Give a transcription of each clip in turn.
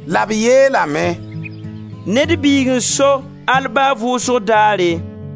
La b yeelame: «Ned Biig n so al ba vʋʋsg daare.»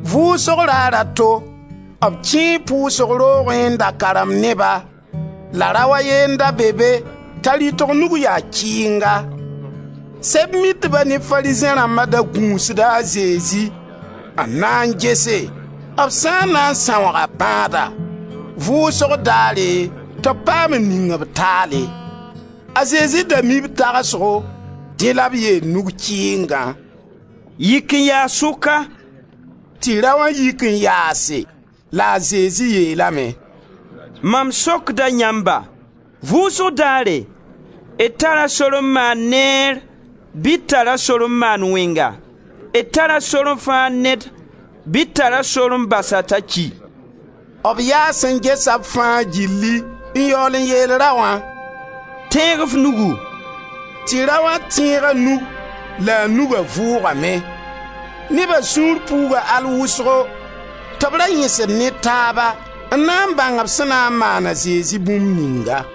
Vʋʋsg raar a to, b kẽe pʋʋsg roogẽ n da karemd neba la rao a ye n da be be t'a rɩtg nug ya kɩɩnga. Sɛb-mitba ne Farizẽ rãmba da gũusda a Zezi, n na n gese b sã n na n sãooga bãada, vʋʋsg daare tɩ b paam n ning-b taale. A Zezi da mii b tagsgo, dẽ la b yeel nug-kɩɩngã: «Yik n yaas sʋka.» Tɩ raoã yik n yaase, la a Zezi yeelame: «Mam sokda yãmba: vʋʋsg daare, d tara sor n maan neer bɩ d tara sor n maan wẽnga? D tara sore n fãag ned bɩ d tara sor n bas-a t'a ki?» B yaas n gesa b fãa gilli n yaool n yeel raoã: «Tẽeg f nugu!» Tɩ raoã tẽeg a nug la a nuga vʋʋgame. Neba sũur puuga al vʋsgo tɩ b ra yẽsd ne taaba n na n bãng b sẽn na n maan a Zezi bũmb ninga.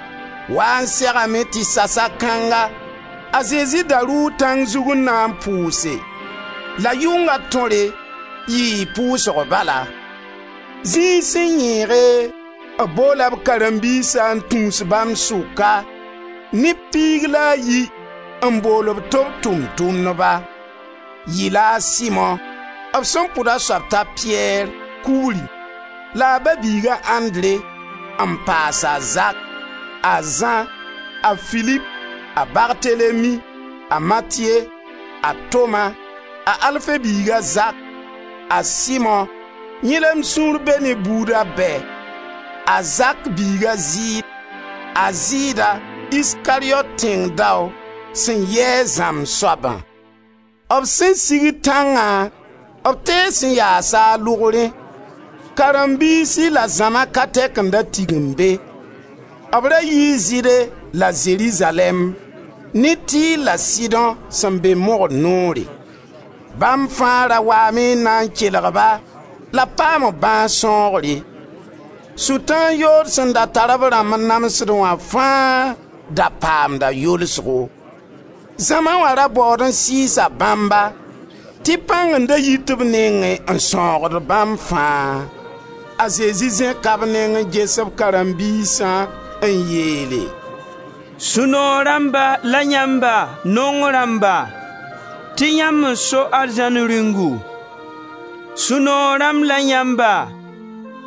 Wa n segame tɩ sasa kãnga a Zezi da rʋʋ tãng zug n na n pʋʋse. La yʋnga tõre yii pʋʋsg bala. Zĩig sẽn yẽege b boola b karen-biisã n tũus bãmb sʋka neb piig la a yi, n bool-b tɩ b Tʋʋm-tʋmdba. Yɩla a Simo, b sẽn pʋd a soab t'a Piyɛr (kugri) la a ba-biig a Andre, n paas a Zak, a Zã, a Filip, a Bartelemi; a Matiye, a Toma; a Alfe biig a Zak; a Simo, yẽ la m sũur be ne buuda bɛ; a Zak biig a Zɩɩd; a Zɩɩda, Iskariyot tẽng dao, sẽn yɩ a zãmb soabã. B sẽn sigd tãngã, b tees n yaasa a lʋgrẽ; karen-biisi la zãma ka tɛk n da tigim be; b ra yii Zɩɩde la Zerizalɛɛm, ne Tir la Sidõ sẽn be mogr noore. Bãmb fãa ra waame n na n kelg-ba la b paam b bãas sãoogre; Sʋtãan yood sẽn da tar b rãmb n namsdẽ wã fãa da paamda yolsgo. Zãma wã ra baood n sɩɩsa bãmba tɩ pãng n da yit b nengẽ n sãoogd bãmb fãa. A Zezi zẽka b neng n ges b karen-biisã n yeele: «Sũ-noog rãmba la yãmba, naong rãmba, tɩ yãmb n so Arzãn Rĩungu. Sũ-noog rãmb la yãmba,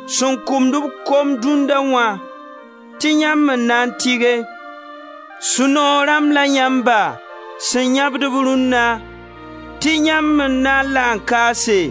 sẽn kũmd-b kom dũnna wã, tɩ yãmb n na n tɩge. Sũ-noog rãmb la yãmba, sẽn yãbd-b rũnna, tɩ yãmb n na n la n kaase.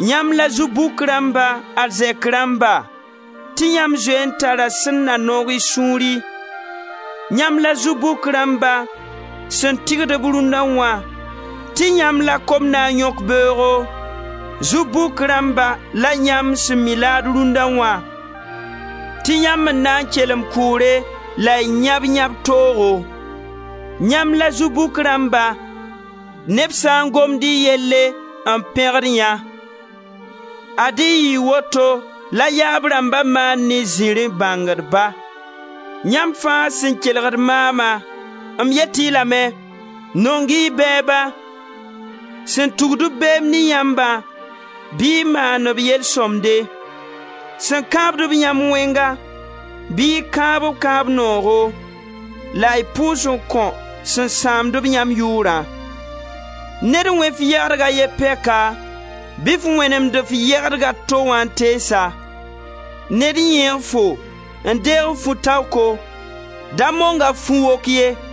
Yãmb la zu-bʋk rãmba, arzɛk rãmba, tɩ yãmb zoe n tara sẽn na noog y sũuri. Yãmb la zu-bʋk rãmba sẽn tɩgd-b rũnna wã tɩ yãmb la kom na n yõk beoogo. Zu-bʋk rãmba la yãmb sẽn mi laad rũnna wã, tɩ yãmb n na n kelem kʋʋre la y yãb yãb-toogo. Yãmb la zu-bʋk rãmba neb sã n gomd y yelle n pẽgd yã. Ad-y yɩɩ woto la yaab rãmba maan ne zirẽ bãngdba. Yãmb fãa sẽn kelgd maama, m yet-y lame: Nong-y y bɛɛba; sẽn tugd-b beem ne yãmbã, bɩ y maan-b yel sõmde. Sẽn kãabd-b yãmb wẽnga bɩ y kãab-b kãab-noogo la y pʋʋs n kõ sẽn sãamd-b yãmb yʋʋrã. Ned wẽ f yɛgdg a ye pɛka bɩ f wẽnemd f yɛdg a to wã n tees-a. Ned yẽeg fo n deeg f fu-taoko, da mong-a f fu-wok ye.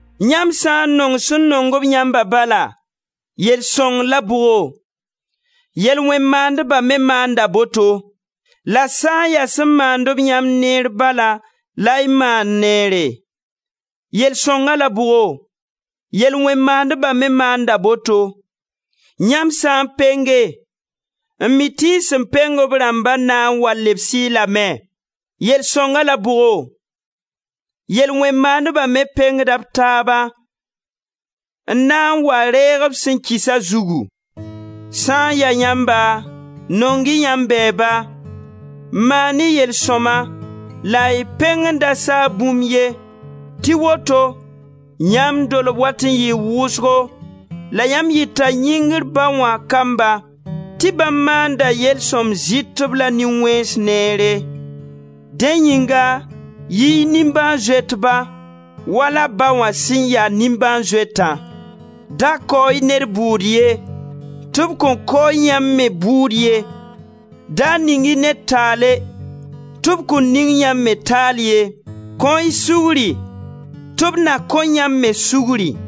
Yãmb sã n nong sẽn nong-b yãmba bala, yell sõng la bʋgo? Yel-wẽn-maandba me maanda boto. La sã n ya sẽn maand-b yãmb neer bala la y maand neere, yell sõnga la bʋgo? Yel-wẽn-maandba me maanda boto. Yãmb sã n penge, n mi tɩ y sẽn peng b rãmba na n wa lebs-y lame, yell sõnga la bʋgo? Yel-wẽn-maandba me pengda b taaba n na n wa reeg b sẽn kɩsa zugu. Sã n ya yãmba, nong-y yãmb bɛɛba, maan-y yel-sõma la y peng n da saag bũmb ye tɩ woto yãmb dolbo wat n yɩɩ wʋsgo la yãmb yɩta Yĩngr Ba wã kamba tɩ bãmb maanda yel-sõm-zɩtb la nin-wẽns neere. Dẽ yĩnga yɩ-y nimbãan-zoetba, wala Ba wã sẽn ya nimbãan-zoetã. Da kao-y ned bʋʋd ye, tɩ b kõn kao yãmb me bʋʋd ye. Da ning-y ned taale tɩ b kõn ning yãmb me taal ye. Kõ-y sugri tɩ b na kõ yãmb me sugri.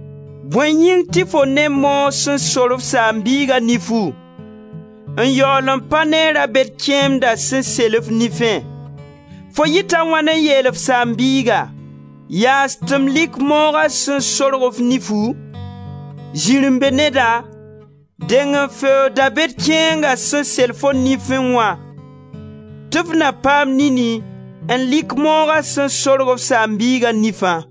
Bõe yĩng tɩ fo ne moog sẽn sor f saam-biiga nifu, n yaool n pa ne ra-bed kẽemdã sẽn sel f nifẽ? Fo yɩta a wãn n yeel f saam-biiga: yaas tɩ m lɩk mooga sẽn sorg f nifu? Zirẽ-be-neda! Deng n feoog da-bed kẽenga sẽn sel fo nifẽ wã tɩ f na paam nini n lɩk mooga sẽn sorg f saam-biiga nifã.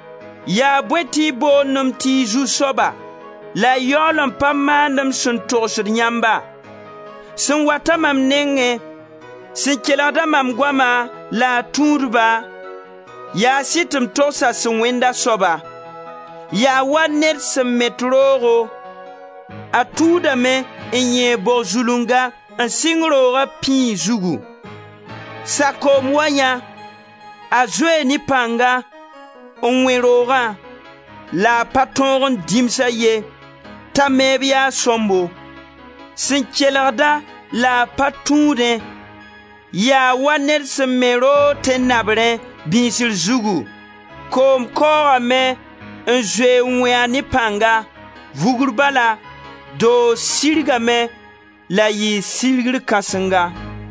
Yaa bõe tɩ y boond-m tɩ y zu-soaba la y yaool n pa maand m sẽn togsd yãmba? Sẽn wat-a mam nengẽ, sẽn kelgd-a mam goama la a tũud-ba, yaas-y tɩ m togs a sẽn wẽnd a soaba. Yaa wa ned sẽn met roogo; a tuudame n yẽeg bog zulunga n sɩng rooga pĩig zugu. Sakoom wa yã, a zoee ne pãnga n wẽ roogã la a pa tõog n dĩms-a ye t'a meeb yaa sõmbo. Sẽn kelgd-a la a pa tũudẽ, yaa wa ned sẽn me roog tẽn-nabrẽ, bĩisri zugu, koom kaoogame n zoe n wẽ-a ne pãnga, vugr bala doog sirgame la yɩɩ sirgr kãsenga.»